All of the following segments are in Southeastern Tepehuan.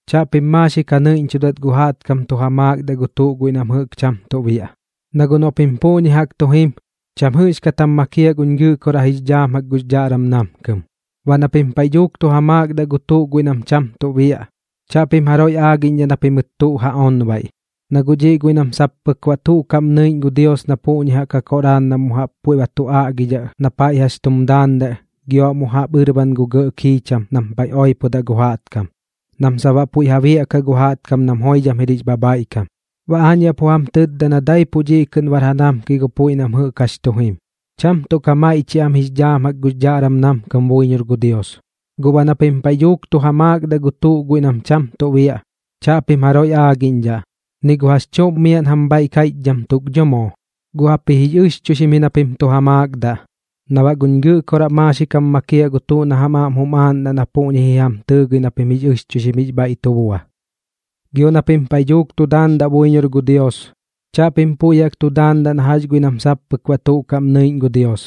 ’Chaꞌpim maaxik ja nɨiꞌñchudat gu jaꞌtkam tu ja maakdaꞌ gu tuꞌ guiꞌ nam jɨꞌk cham tuꞌ biaꞌ. Na guꞌ noꞌ pim puꞌñi jaꞌk tu jim, cham jɨꞌxkat jam makiaꞌ guñ Gɨꞌkoraꞌ jix dhaam jaꞌk gux dhaꞌram namkɨm. Baꞌ na pim paiꞌ dhuuk tu ja maakdaꞌ gu tuꞌ guiꞌ nam cham tuꞌ biaꞌ, chaꞌpim jaroiꞌ aagiꞌñdhaꞌ na pimɨt tuꞌ ja onbaiꞌ, na guꞌ dhiꞌ guiꞌ nam sap pɨk baꞌ tuꞌ kaꞌm nɨiꞌñ gu Dios na puꞌñi jaꞌk ja koꞌraar nam mu jaꞌp puiꞌ ba tu aꞌgidhaꞌ na paiꞌ jax tum daandaꞌ gio baꞌ mu jaꞌp ɨrban gu gɇꞌ kiicham nam paiꞌ oipodaꞌ gu jaꞌtkam, sap nam baꞌ puiꞌ ja biaꞌkaꞌ gu jaꞌtkam nam joidham jir jix bhabhaiꞌkam. Baꞌ aañ yaꞌ pu jam tɨtda na daipuꞌ dhiꞌ kɨꞌn bar ja namkiꞌ gu puiꞌ nam jɨꞌk jax tu jim, cham tuꞌ ka maiꞌchiaꞌ am jix dhaam jaꞌk gux dhaꞌram namkɨm buiñor gu Dios. Guꞌ baꞌ na pim paiꞌ dhuuk tu ja maakdaꞌ gu tuꞌ guiꞌ nam cham tuꞌ biaꞌ, chaꞌpim jaroiꞌ aagiꞌñdhaꞌ, ni gu jax chuꞌm miaꞌn jam bhaiꞌ kaiꞌchdham tuk dho moo. Guꞌ jaꞌpji jix ɨxchuixim ji na pim tu ja maakdaꞌ, na baꞌ guꞌ guñ Gɨꞌkoraꞌ maaxik jam makiaꞌ gu tuꞌ na jam aꞌm jum aaꞌndaꞌ na puꞌñi ji jam tɨɨgɨi na pim jix ɨxchuixim jix bhaiꞌ tu bua. ’Gio na pim paiꞌ dhuuk tu daandaꞌ buiñor gu Dios, chaꞌpim puiꞌ jaꞌk tu daandaꞌ na jax guiꞌ nam sap pɨk baꞌ tuꞌ kaꞌm nɨiꞌñ gu Dios,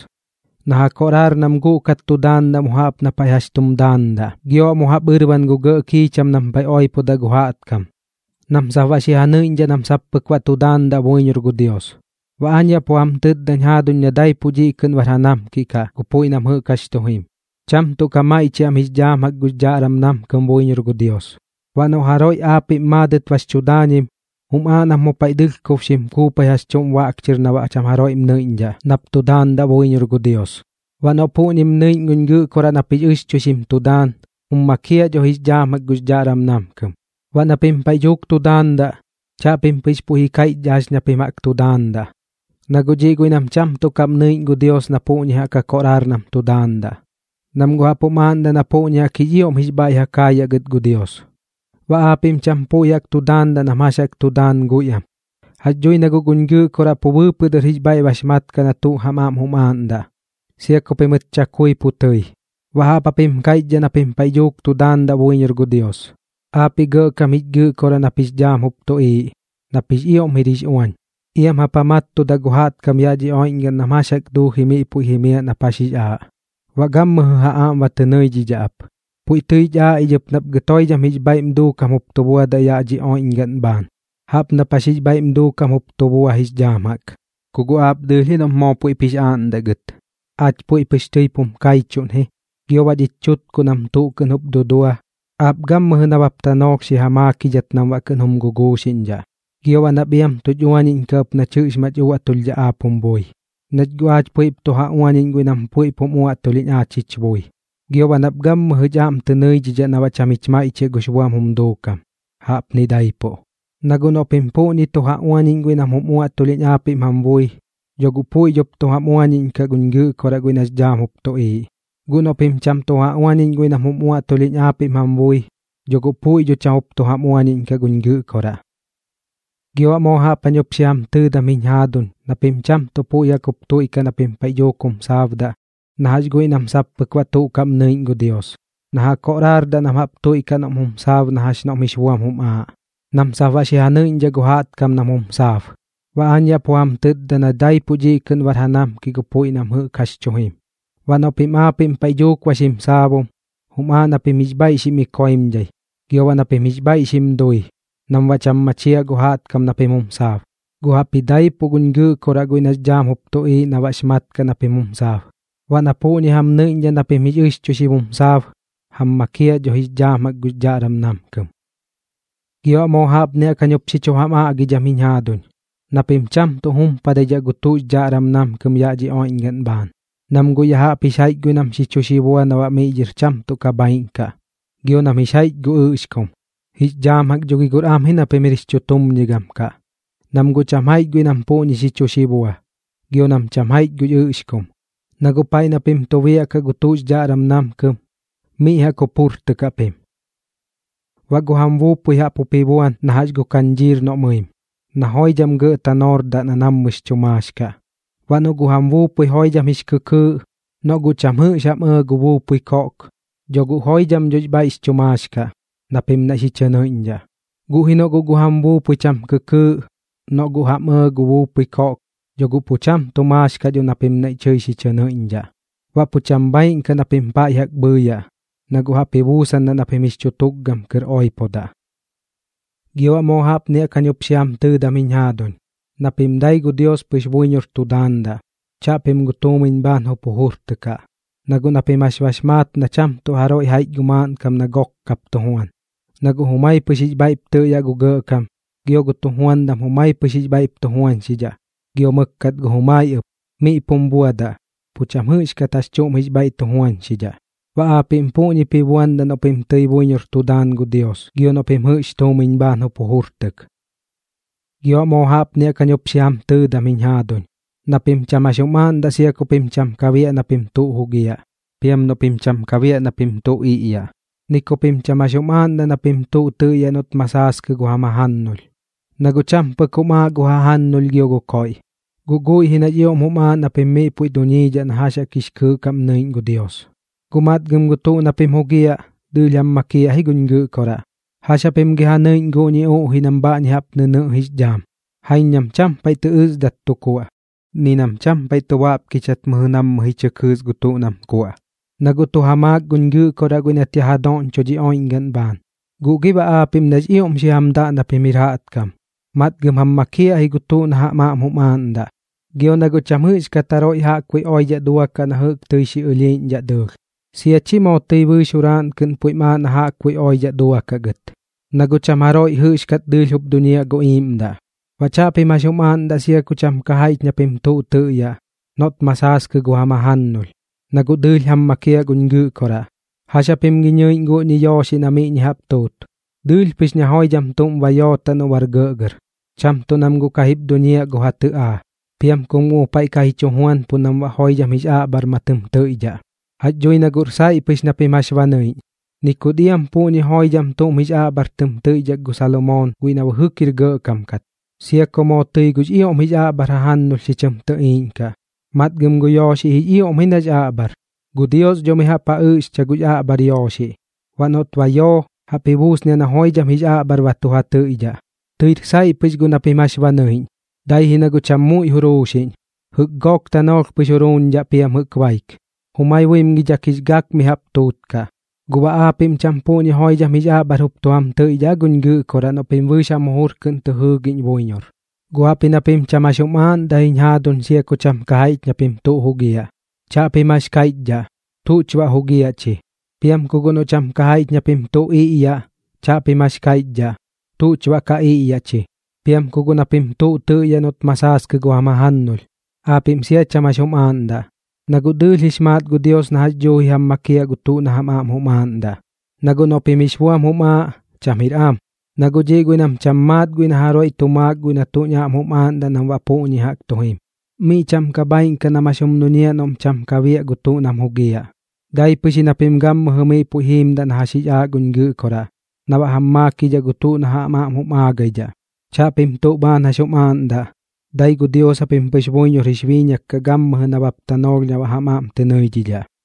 na ja koꞌraar nam guꞌkat tu daandaꞌ mu jaꞌp na paiꞌ jax tum daandaꞌ gio baꞌ mu jaꞌp ɨrban gu gɇꞌ kiicham nam paiꞌ oipodaꞌ gu jaꞌtkam, nam sap baꞌ xi ja nɨiꞌñdhaꞌ nam sap pɨk baꞌ tu daandaꞌ buiñor gu Dios. Baꞌ aañ yaꞌ pu jam tɨtdañ jaaduñ na daipuꞌ dhiꞌ kɨꞌn bar ja namkiꞌ kaꞌ gu puiꞌ nam jɨꞌk jax tu jim, cham tuꞌ ka maiꞌchiaꞌ am jix dhaam jaꞌk gux dhaꞌram namkɨm buiñor gu Dios. Baꞌ noꞌ jaroiꞌ aapiꞌm maadɨt bax chu daañim, jum aaꞌ nap mu paiꞌ dɨlhkob xim kuupai jax chuꞌm baꞌk chɨr na baꞌ cham jaroiꞌm nɨiꞌñdhaꞌ nap tu daandaꞌ buiñor gu Dios. Baꞌ noꞌ puꞌñim nɨiꞌñ guñ Gɨꞌkoraꞌ nap jix ɨxchuixim tu daan, jum makiaꞌ dho jix dhaam jaꞌk gux dhaꞌram namkɨm. ’Baꞌ na pim paiꞌ dhuuk tu daandaꞌ, chaꞌpim pɨx puiꞌ ji kaiꞌchdhaꞌ jax ña pim jaꞌk tu daandaꞌ, na guꞌ dhiꞌ guiꞌ nam cham tuꞌ kaꞌm nɨiꞌñ gu Dios na puꞌñi jaꞌk ja koꞌraar nam tu daandaꞌ, nam guꞌ jaꞌp jum aaꞌndaꞌ na puꞌñi jaꞌk jix ioꞌm jix bhaiꞌ ja kaayaꞌ gɨt gu Dios. Baꞌ aapiꞌm cham puiꞌ jaꞌk tu daandaꞌ nam jax jaꞌk tu daan guiꞌam. Jax dhui na guꞌ guñ Gɨꞌkoraꞌ pu bɨɨpɨꞌ dɨr jix bhaiꞌ bax maat kaꞌ na tuꞌ jam aꞌm jum aaꞌndaꞌ, sia ku pimɨt chakui pu tɨi. Baꞌ jaꞌp japim kaiꞌchdhaꞌ na pim paiꞌ dhuuk tu daandaꞌ buiñor gu Dios: Aapiꞌ Gɇꞌkam jich Gɨꞌkoraꞌ nap jix dhaam jup tuꞌiiꞌ, nap jix ioꞌm jir jix uañ, iam jap ja mattudaꞌ gu jaꞌtkam yaꞌ dhi oiꞌñgaꞌn nam jax jaꞌk duuji miꞌ puiꞌ jimiaꞌ nap jax jix aaꞌ, baꞌ gammɨjɨ ja aꞌm ba tɨ nɨidhidhaꞌ ap. Puiꞌ tɨich aaꞌ ich ɨp nap gɨt puiꞌ joidham jix bhaiꞌm duukam jup tu buadaꞌ ya jaꞌp dhi oiꞌñgaꞌn bhaan, jaꞌp nap jax jix bhaiꞌm duukam jup tu bua jix dhaam jaꞌk. Ku guꞌ aap dɨɨlh ji noꞌp moo puiꞌp jix aaꞌndaꞌ gɨt, aach puiꞌ pɨx tɨip jum kaiꞌchuꞌn ji. Gio baꞌ dhich chutkuꞌ nam tuꞌ kɨꞌn jup dudua, aap gammɨjɨ nabap tanoolh xi ja maakidhat nam baꞌ kɨꞌn jum guguuxiꞌñdhaꞌ. Gio baꞌ nap iam tuch uañiꞌñkaꞌ ɨp nach jɨꞌx mach uaꞌtulhdhaꞌ aap jum bui, nach guꞌ aach puiꞌp tu ja uañiꞌñ guiꞌ nam puiꞌp jum uaꞌtulhiꞌñ aach jich bui. Gio baꞌ nap gammɨjɨ jich aꞌm tɨ nɨidhidhaꞌ na baꞌ cham jich maiꞌchiaꞌ gux buam jum duukam. Jaꞌpni daipuꞌ. ’Na guꞌ noꞌ pim puꞌñi tu ja uañiꞌñ guiꞌ nam jum uaꞌtulhiꞌñ aapiꞌm jam bui, dho guꞌ puiꞌ dhop tu jam uañiꞌñkaꞌ guñ Gɨꞌkoraꞌ guiꞌ nax dhaam jup tuꞌiiꞌ. Guꞌ noꞌ pim cham tu ja uañiꞌñ guiꞌ nam jum uaꞌtulhiꞌñ aapiꞌm jam bui, dho guꞌ puiꞌ dho cham jup tu jam uañiꞌñkaꞌ guñ Gɨꞌkoraꞌ. ’Gio baꞌ moo jaꞌp jañ jup xi jam tɨɨdam jiñ jaaduñ na pim cham tuꞌ puiꞌ jaꞌk tuiꞌkaꞌ na pim paiꞌ dhuuk jum saabdaꞌ na jax guiꞌ nam sap pɨk baꞌ tuꞌ kaꞌm nɨiꞌñ gu Dios, na ja koꞌraardaꞌ nam jaꞌp tuiꞌkaꞌ noꞌm jum saab na jax noꞌm jix buam jum aaꞌ, nam sap baꞌ xi ja nɨiꞌñdhaꞌ gu jaꞌtkam nam jum saab. Baꞌ aañ yaꞌ pu jam tɨtda na daipuꞌ dhiꞌ kɨꞌn bar ja namkiꞌ gu puiꞌ nam jɨꞌk jax tu jim. Baꞌ noꞌ pim aapiꞌm paiꞌ dhuuk ba xim saabum, jum aaꞌ na pim jix bhaiꞌ xim ikoimdhai, gio baꞌ na pim jix bhaiꞌ xim dui, nam baꞌ cham machiaꞌ gu jaꞌtkam na pim jum saab, guꞌ jaꞌpji daipuꞌ guñ Gɨꞌkoraꞌ guiꞌ nax dhaam jup tuꞌiiꞌ na baꞌx mat kaꞌ na pim jum saab. Baꞌ na puꞌñi jam nɨiꞌñdhaꞌ na pim jix ɨxchuixim jum saab, jam makiaꞌ dho jix dhaam jaꞌk gux dhaꞌram namkɨm. ’Gio baꞌ moo jaꞌpni jaꞌk jañ jup xi chu jam aꞌgidham jiñ jaaduñ, na pim cham tu jumpadidhaꞌ gu tuꞌx dhaꞌram namkɨm yaꞌ dhi oiꞌñgaꞌn bhaan, nam guꞌ ya jaꞌp jix jaiꞌch guiꞌ nam xi chu xibua na baꞌ miꞌ dhɨr cham tuꞌ ka bhaaiꞌñ kaꞌ, gio nam jix jaiꞌch gu ɨꞌxkum. Jix dhaam jaꞌk dho gi guꞌr am ji na pim jir jix chutumñigam kaꞌ, nam guꞌ cham jaiꞌch guiꞌ nam puꞌñi xi chu xibua, gio nam cham jaiꞌch gu ɨꞌxkum. Na guꞌ paiꞌ na pim tu biaꞌkaꞌ gu tuꞌx dhaꞌram namkɨm, miꞌ jaꞌk jup jujurtɨkaꞌ pim. ’Baꞌ gu jam buupui jaꞌp ji buan na jax gu kañdhiir noꞌ mɨim, na joidham gɇꞌ tanoordaꞌ na nammɨx chu maax kaꞌ. Baꞌ noꞌ gu jam buupui joidham jix kɨkɨɨꞌ, noꞌ guꞌ cham jɨꞌx jam ɇɇ gu buupui koꞌk, dho guꞌ joidham dho jix bhaiꞌx chu maax kaꞌ na pim naiꞌ xi chɨ nɨiꞌñdhaꞌ. Guꞌ ji noꞌ guꞌ gu jam buupui cham kɨkɨɨꞌ, noꞌ guꞌ jam ɇɇ gu buupui koꞌk, dho guꞌ pu cham tu maax kaꞌ dho na pim naiꞌ tɨi xi chɨ nɨiꞌñdhaꞌ, baꞌ pu cham bhaaiꞌñ kaꞌ dho na pim paiꞌ jaꞌk bhɨɨyaꞌ, na guꞌ jaꞌp ji buusandaꞌ na pim jix chu tukgam kɨr oipodaꞌ. ’Gio baꞌ moo jaꞌpni jaꞌk jañ jup xi jam tɨɨdam jiñ jaaduñ, na pim dai gu Dios pɨx buiñor tu daandaꞌ, chaꞌpim gu tuumiñ bhaan jup jujurtɨkaꞌ. Na guꞌ na pim jax bax maat na cham tuꞌ jaroiꞌ jaiꞌch gu maaꞌnkam na gook kap tu juan, na guꞌ jumai pɨx jix bhaiꞌp tɨꞌyaꞌ gu gɇꞌkam, gio gu tujuandam jumai pɨx jix bhaiꞌp tu juañxidhaꞌ, gio mɨkkat jumai ɨp. Miꞌ pum buadaꞌ, pu cham jɨꞌxkat jax chuꞌm jix bhaiꞌ tu juañxidhaꞌ. Baꞌ aapiꞌm puꞌñip ji buandaꞌ noꞌ pim tɨi buiñor tu daan gu Dios gio noꞌ pim jɨꞌx tuumiñ bhaan jup jujurtɨk. ’Gio baꞌ moo jaꞌpni jaꞌk jañ jup xi jam tɨɨdam ɨp jiñ jaaduñ, na pim cham jax jum aaꞌndaꞌ sia ku pim cham ka biaꞌ na pim tuꞌ jugiaꞌ, piam noꞌ pim cham ka biaꞌ na pim tuꞌ iꞌyaꞌ, ni ku pim cham jax jum aaꞌndaꞌ na pim tuꞌ tɨꞌyaꞌ noꞌt ma saaskɨ gu jam jajannulh. Na guꞌ cham pɨk jum aaꞌ gu jajannulh gio gu koiꞌ, guꞌ guiꞌ ji nax ioꞌm jum aaꞌ na pim miꞌ puiꞌ duñiidhaꞌ na jax jaꞌk jix kɨɨꞌ kaꞌm nɨiꞌñ gu Dios. Guꞌ matgɨm gu tuꞌ na pim jugiaꞌ, dɨɨlh jam makiaꞌ ji guñ Gɨꞌkoraꞌ. ¿Jax japim gi ja nɨiꞌñ guꞌñi uꞌjiꞌ nam bha jaꞌp nɨnɨꞌ jix dhaam? Jaiñ nam cham paiꞌ tɨ ɨsdat tu kuaꞌ, ni nam cham paiꞌ tu baꞌpkichat mɨjɨ nammɨ ji chɨ kɨɨs gu tuꞌ nam kuaꞌ, na guꞌ tu ja maak guñ Gɨꞌkoraꞌ guiꞌ nat yaꞌ ja doꞌñcho dhi oiꞌñgaꞌn bhaan. Guꞌ gi baꞌ aapiꞌm nax ioꞌm xi jam daꞌ na pim jir jaꞌtkam, matgɨm jam makiaꞌ ji gu tuꞌ na jam aꞌm jum aaꞌndaꞌ. Gio na guꞌ cham jɨꞌxkat jaroiꞌ jaꞌkbuiꞌ oidhaꞌ duakaꞌ na jɨꞌk tɨi xi ɨlhiiꞌñdhaꞌ dɨɨlh, sia chi moo tɨi bɨɨx juraaꞌn kɨꞌn puiꞌm aaꞌ na jaꞌkbuiꞌ oiꞌdhaꞌ duakaꞌ gɨt, na guꞌ cham jaroiꞌ jɨꞌxkat dɨɨlh jup duñiaꞌ gu iiꞌmdaꞌ. ’Baꞌ chaꞌpim jax jum aaꞌndaꞌ sia ku cham ka jaiꞌch na pim tuꞌ tɨꞌyaꞌ noꞌt ma saaskɨ gu jam jajannulh, na guꞌ dɨɨlh jam makiaꞌ guñ Gɨꞌkoraꞌ. ¿Jax japim gi nɨiꞌñ guꞌñi yooxiꞌ na miꞌñi jaꞌp tuut? Dɨɨlh pɨx na joidham tuꞌm ba yootaꞌ noꞌ bar gɇꞌgɇr, cham tuꞌ nam guꞌ ka jip tu duñiaꞌ gu ja tɨꞌaa, piam kum guꞌ mu paiꞌ ka ji chu juanpuꞌ nam baꞌ joidham jix aꞌbhar ma tɨm tɨiꞌdhaꞌ. Jax dhui na guꞌr saiꞌ pɨx na pim jax ba nɨiꞌñ, ni kut iam puꞌñi joidham tuꞌm jix aꞌbhar tɨm tɨiꞌdhak gu Salomoon guiꞌ na bɨjɨk jir gɇꞌkam kat. Sia ku moo tɨi gux ioꞌm jix aꞌbhar jajannulh xi chɨm tɨtɨiꞌñdhaꞌ, matgɨm gu yooxiꞌ jix ioꞌm ji nax aꞌbhar. Gu Dios dho mi jaꞌp ja ɨꞌxcha gux aꞌbhar yooxiꞌ. Baꞌ noꞌt ba yoo, jaꞌp ji buusniaꞌ na joidham jix aꞌbhar ba tu ja tɨiꞌdhaꞌ. Tɨir saiꞌ pɨx guꞌ na pim jax ba nɨiꞌñ, dai ji na guꞌ cham muiꞌ juruuxiꞌñ. Jɨꞌk gook tanoolh pɨx juruuñdhaꞌ piam jɨꞌk baik, jumai buimgidhak jix gak mi jaꞌp tuutkaꞌ. ¿Gu baꞌ aapiꞌm cham puꞌñi joidham jix aꞌbhar jup tu jam tɨiꞌdhaꞌ aa guñ Gɨꞌkoraꞌ noꞌ pim bɨɨx jam jujur kɨꞌn tɨ jɨɨgiꞌñ buiñor? Guꞌ jaꞌpji na pim cham jax jum aaꞌndaꞌ ji jiñ jaaduñ sia ku cham ka jaiꞌch na pim tuꞌ jugiaꞌ. Chaꞌpim jax kaiꞌchdhaꞌ: “¿Tuꞌch baꞌ jugiaꞌ chi?” Piam ku guꞌ noꞌ cham ka jaiꞌch na pim tuꞌ iꞌyaꞌ, chaꞌpim jax kaiꞌchdhaꞌ: “¿Tuꞌch baꞌ ka iꞌyaꞌ chi?” Piam ku guꞌ na pim tuꞌ tɨꞌyaꞌ noꞌt ma saaskɨ gu jam jajannulh, aapiꞌm sia cham jax jum aaꞌndaꞌ. Na guꞌ dɨɨlh jix maat gu Dios na jax dhuuji jam makiaꞌ gu tuꞌ na jam aꞌm jum aaꞌndaꞌ. Na guꞌ noꞌ pim jix buam jum aaꞌ, cham jir am, na guꞌ dhiꞌ guiꞌ nam cham maat guiꞌ na jaroiꞌ tu maak gu tuꞌ nañ aꞌm jum aaꞌndaꞌ nam baꞌ puꞌñi jaꞌk tu jim. Miꞌ cham ka bhaaiꞌn kaꞌ nam jax jum duñiaꞌ noꞌm cham ka biaꞌ gu tuꞌ nam jugiaꞌ. Dai pɨx ji na pim gammɨjɨ miꞌ puiꞌ jiimdaꞌ na jax jix aaꞌ guñ Gɨꞌkoraꞌ na baꞌ jam makiidhaꞌ gu tuꞌ na jam aꞌm jum aagidhaꞌ. Chaꞌpim tuꞌ bhaan jax jum aaꞌndaꞌ, dai gu Dios japim pɨx buiñor jix biiñak kaꞌ gammɨjɨ nabap tanoolh na baꞌ jam aꞌm tɨ nɨidhidhaꞌ.